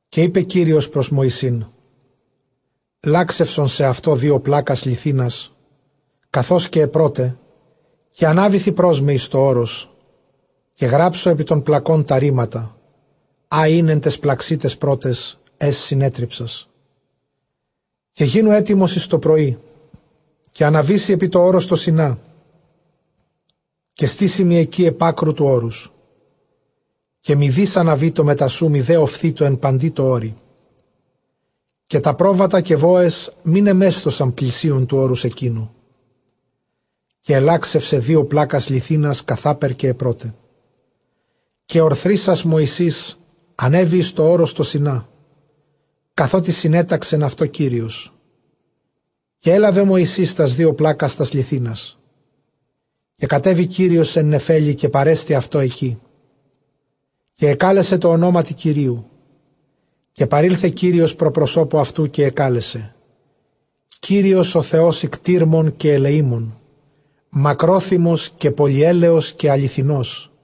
Καὶ εἶπε Κύριος πρὸς Μωυσῆν λαξευσον σεαυτῷ δύο πλάκας λιθίνας, καθὼς καὶ αἱ πρῶται, καὶ ἀνάβηθι πρὸς μὲ εἰς τὸ ὄρος, καὶ γράψω ἐπὶ τῶν πλακῶν τὰ ῥήματα ἃ ἦν ἐν ταῖς πλαξὶ ταῖς πρώταις, αἷς συνέτριψας. Καὶ γίνου ἕτοιμος εἰς τὸ πρωί, καὶ ἀναβήσῃ ἐπὶ τὸ ὄρος τὸ Σινά, καὶ στήσῃ μοι ἐκεῖ ἐπʼ ἄκρου τοῦ ὄρους. Καὶ μηδεὶς ἀναβήτω μετὰ σοῦ μηδὲ ὀφθήτω ἐν παντὶ τῷ ὄρει· καὶ τὰ πρόβατα καὶ βόες μὴ νεμέσθωσαν πλησίον τοῦ ὄρους ἐκείνου. Καὶ ἐλάξευσε δύο πλάκας λιθίνας, καθάπερ καὶ αἱ πρῶται· καὶ ὀρθρίσας Μωυσῆς, ἀνέβη εἰς τὸ ὄρος τὸ Σινὰ, καθότι συνέταξεν αὐτῷ Κύριος· καὶ ἔλαβε Μωυσῆς τὰς δύο πλάκας τὰς λιθίνας. Καὶ κατέβη Κύριος ἐν νεφέλῃ, καὶ παρέστη αὐτῷ ἐκεῖ, καὶ ἐκάλεσε τῷ ὀνόματι Κυρίου. Καὶ παρῆλθε Κύριος πρὸ προσώπου αὐτοῦ, καὶ ἐκάλεσε κύριος ὁ Θεὸς οἰκτείρμων καὶ ἐλεήμων, μακρόθυμος καὶ πολυέλεος καὶ ἀληθινός,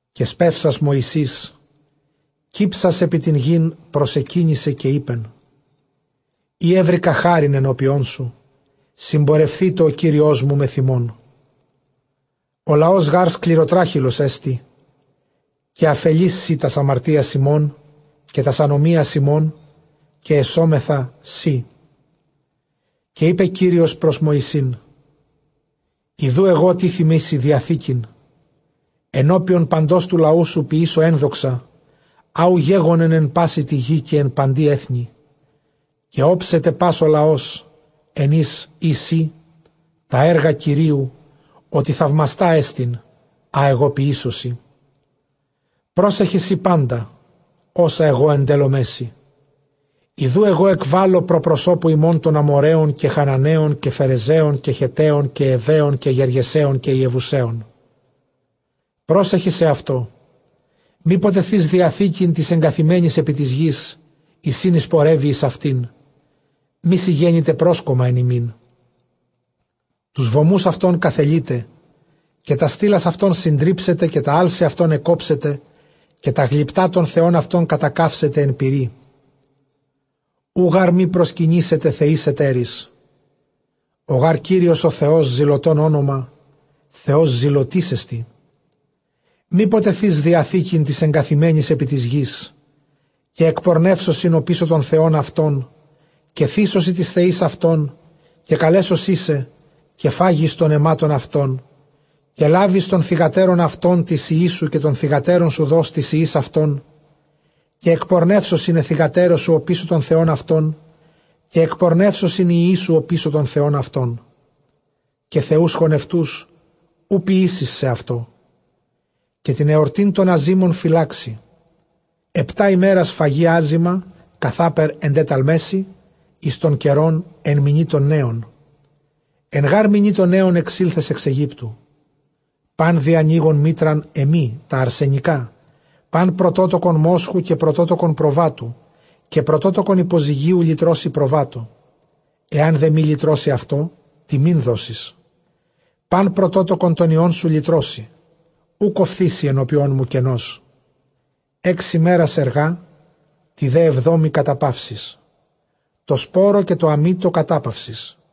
Καὶ σπεύσας Μωσῆς κύψας ἐπὶ τὴν γῆν προσεκύνησε· καὶ εἶπεν, εἰ εὕρηκα χάριν ἐνώπιόν σου, συμπορευθήτω ὁ Κύριός μου μεθʼ ἡμῶν· ὁ λαὸς γὰρ σκληροτράχηλός ἐστι, καὶ ἀφελεῖς σὺ τὰς ἁμαρτίας ἡμῶν, καὶ τὰς ἀνομίας ἡμῶν, καὶ ἐσόμεθά σοι. Καὶ εἶπε Κύριος πρὸς Μωυσῆν, Ἰδοὺ, ἐγὼ τίθημί σοι διαθήκην ἐνώπιον παντὸς τοῦ λαοῦ σοῦ, ποιήσω ἔνδοξα, ἃ οὐ γέγονεν ἐν πάσῃ τῇ γῇ, καὶ ἐν παντὶ ἔθνει· καὶ ὄψεται πᾶς ὁ λαὸς, ἐν οἷς εἶ σὺ, τὰ ἔργα Κυρίου, ὅτι θαυμαστά ἐστιν, ἃ ἐγὼ ποιήσω σοι. Πρόσεχε σὺ πάντα ὅσα ἐγὼ ἐντέλλομαί σοι· ἰδοὺ ἐγὼ ἐκβάλλω πρὸ προσώπου ὑμῶν τὸν Ἀμοῤῥαῖον, καὶ Χαναναῖον, καὶ Φερεζαῖον, καὶ Χετταῖον, καὶ Εὑαῖον, καὶ Γεργεσαῖον, καὶ Ἰεβουσαῖον. Πρόσεχε σεαυτῷ, μή ποτε θῇς διαθήκην τοῖς ἐγκαθημένοις ἐπὶ τῆς γῆς, εἰς ἣν εἰσπορεύῃ εἰς αὐτὴν, μή σοι γένηται πρόσκομμα ἐν ὑμῖν. Τοὺς βωμοὺς αὐτῶν καθελεῖτε, καὶ τὰς στήλας αὐτῶν συντρίψετε, καὶ τὰ ἄλση αὐτῶν ἐκκόψετε, καὶ τὰ γλυπτὰ τῶν θεῶν αὐτῶν κατακαύσετε ἐν πυρί. Οὐ γὰρ μὴ προσκυνήσητε θεοῖς ἑτέροις· ὁ γὰρ Κύριος ὁ Θεὸς, ζηλωτὸν ὄνομα, Θεὸς ζηλωτής ἐστι. Μή ποτε θῇς διαθήκην τοῖς ἔγκαθημένοις ἐπὶ τῆς γῆς, καὶ ἐκπορνεύσωσιν ὀπίσω τῶν θεῶν αὐτῶν, καὶ θύσωσι τοῖς θεοῖς αὐτῶν, καὶ καλέσωσίν σε, καὶ φάγῃς τῶν αὐτῶν, καὶ λάβῃς τῶν θυγατέρων αὐτῶν τοῖς υἱοῖς σου, καὶ τῶν θυγατέρων σου δῷς τοῖς υἱοῖς αὐτῶν, καὶ ἐκπορνεύσωσιν αἱ θυγατέρες σου ὀπίσω τῶν θεῶν αὐτῶν, καὶ ἐκπορνεύσωσιν οἱ υἱοί σου ὀπίσω τῶν θεῶν αὐτῶν. Καὶ θεοὺς χωνευτοὺς οὐ ποιήσεις σεαυτῷ. Καὶ τὴν ἑσρτὴν τῶν ἀζύμων φυλάξῃ· ἑπτὰ ἡμέρας φαγῃ ἄζυμα, καθάπερ ἐντέταλμαί σοι, εἰς τὸν καιρὸν ἐν μηνὶ τῶν νέων· ἐν γὰρ μηνὶ τῶν νέων ἐξῆλθες ἐξ Αἰγύπτου. Πᾶν διανοῖγον μήτραν, ἐμοὶ τὰ ἀρσενικὰ, πᾶν πρωτότοκον μόσχου, καὶ πρωτότοκον προβάτου. Καὶ πρωτότοκον ὑποζυγίου λυτρώσῃ προβάτῳ· ἐὰν δὲ μὴ λυτρώσῃ αὐτὸ, τιμὴν δώσεις. πᾶν πρωτότοκον τῶν υἱῶν σου λυτρώσῃ· οὐκ ὀφθήσῃ ἐνώπιόν μου κενός. Ἓξ ἡμέρας ἐργᾷ, τῇ δὲ ἑβδόμῃ καταπαύσεις· τῷ σπόρῳ καὶ τῷ ἀμητῷ κατάπαυσις.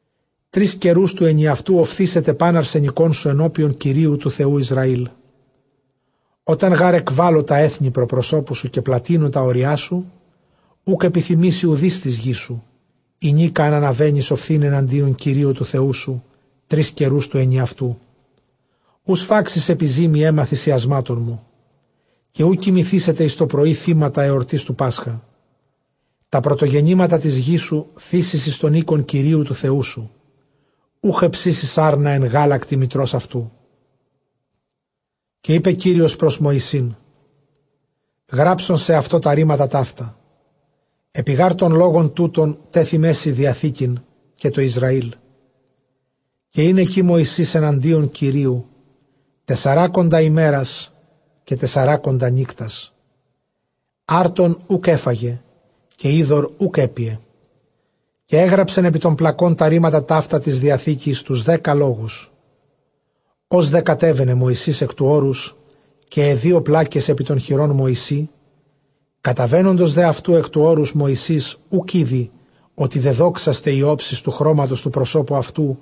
Τρεῖς καιροὺς τοῦ ἐνιαυτοῦ ὀφθήσεται πᾶν ἀρσενικόν σου ἐνώπιον Κυρίου τοῦ Θεοῦ Ἰσραήλ. Ὅταν γὰρ ἐκβάλω τὰ ἔθνη πρὸ προσώπου σου, καὶ πλατυνῶ τὰ ὅριά σου, οὐκ ἐπιθυμήσει οὐδεὶς τῆς γῆς σου, ἡνίκα ἂν ἀναβαίνῃς ὀφθῆναι ἐναντίον Κυρίου τοῦ Θεοῦ σου, τρεῖς καιροὺς τοῦ ἐνιαυτοῦ. Οὐ σφάξεις ἐπὶ ζύμῃ αἷμα θυμιαμάτων μου, καὶ οὐ κοιμηθήσεται εἰς τὸ πρωῒ θύματα ἑορτῆς τοῦ πάσχα. Τὰ πρωτογεννήματα τῆς γῆς σου θήσεις εἰς τὸν οἶκον Κυρίου τοῦ Θεοῦ σου· οὐχ ἑψήσεις ἄρνα ἐν γάλακτι μητρὸς αὐτοῦ. Καὶ εἶπε Κύριος πρὸς Μωυσῆν, γράψον σεαυτῷ τὰ ῥήματα ταῦτα· ἐπὶ γὰρ τῶν λόγων τούτων τέθειμαί σοι διαθήκην, καὶ τῷ Ἰσραήλ. Καὶ ἦν ἐκεῖ Μωυσῆς ἐναντίον Κυρίου τεσσεράκοντα ἡμέρας, καὶ τεσσεράκοντα νύκτας· ἄρτον οὐκ ἔφαγε, καὶ ὕδωρ οὐκ ἔπιε· καὶ ἔγραψεν ἐπὶ τῶν πλακῶν τὰ ῥήματα ταῦτα τῆς διαθήκης, τοὺς δέκα λόγους. Ὡς δὲ κατέβαινε Μωυσῆς ἐκ τοῦ ὄρους, καὶ αἱ δύο πλάκες ἐπὶ τῶν χειρῶν Μωυσῆ· καταβαίνοντος δὲ αὐτοῦ ἐκ τοῦ ὄρους, Μωυσῆς οὐκ ᾔδει ὅτι δεδόξασται ἡ ὄψις τοῦ χρώματος τοῦ προσώπου αὐτοῦ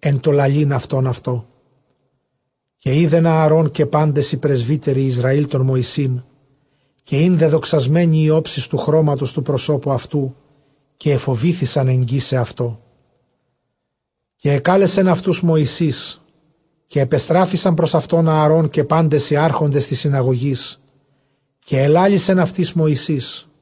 ἐν τῷ λαλεῖν αὐτὸν αὐτῷ. Καὶ εἶδεν Ἀαρὼν καὶ πάντες οἱ πρεσβύτεροι Ἰσραὴλ τὸν Μωυσῆν, καὶ ἦν δεδοξασμένη ἡ ὄψις τοῦ χρώματος τοῦ προσώπου αὐτοῦ. καὶ ἐφοβήθησαν ἐγγίσαι αὐτῷ. Καὶ ἐκάλεσεν αὐτοὺς Μωυσῆς, καὶ ἐπεστράφησαν πρὸς αὐτὸν Ἀαρὼν καὶ πάντες οἱ ἄρχοντες τῆς συναγωγῆς· καὶ ἐλάλησεν αὐτοῖς Μωυσῆς.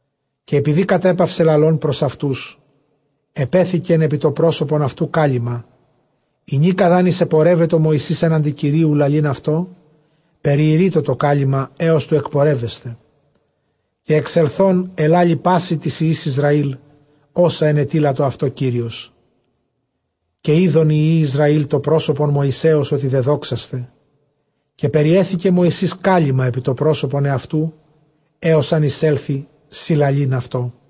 Καὶ ἐπειδὴ κατέπαυσε λαλῶν πρὸς αὐτοὺς, ἐπέθηκεν ἐπὶ τὸ πρόσωπον αὐτοῦ κάλυμμα. Ἡνίκα δʼ ἂν εἰσεπορεύετο Μωυσῆς, ἔναντι Κυρίου λαλεῖν αὐτῷ, περιῃρεῖτο τὸ κάλυμμα ἕως τοῦ ἐκπορεύεσθαι· καὶ ἐξελθὼν ἐλάλει πᾶσι τοῖς υἱοῖς Ἰσραὴλ ὅσα ἐνετείλατο αὐτῷ Κύριος. Καὶ εἶδον οἱ υἱοὶ Ἰσραὴλ τὸ πρόσωπον Μωυσέως, ὅτι δεδόξασται· καὶ περιέθηκε Μωυσῆς κάλυμμα ἐπὶ τὸ πρόσωπον ἑαυτοῦ, ἕως ἂν εἰσέλθῃ συλλαλεῖν αὐτῷ.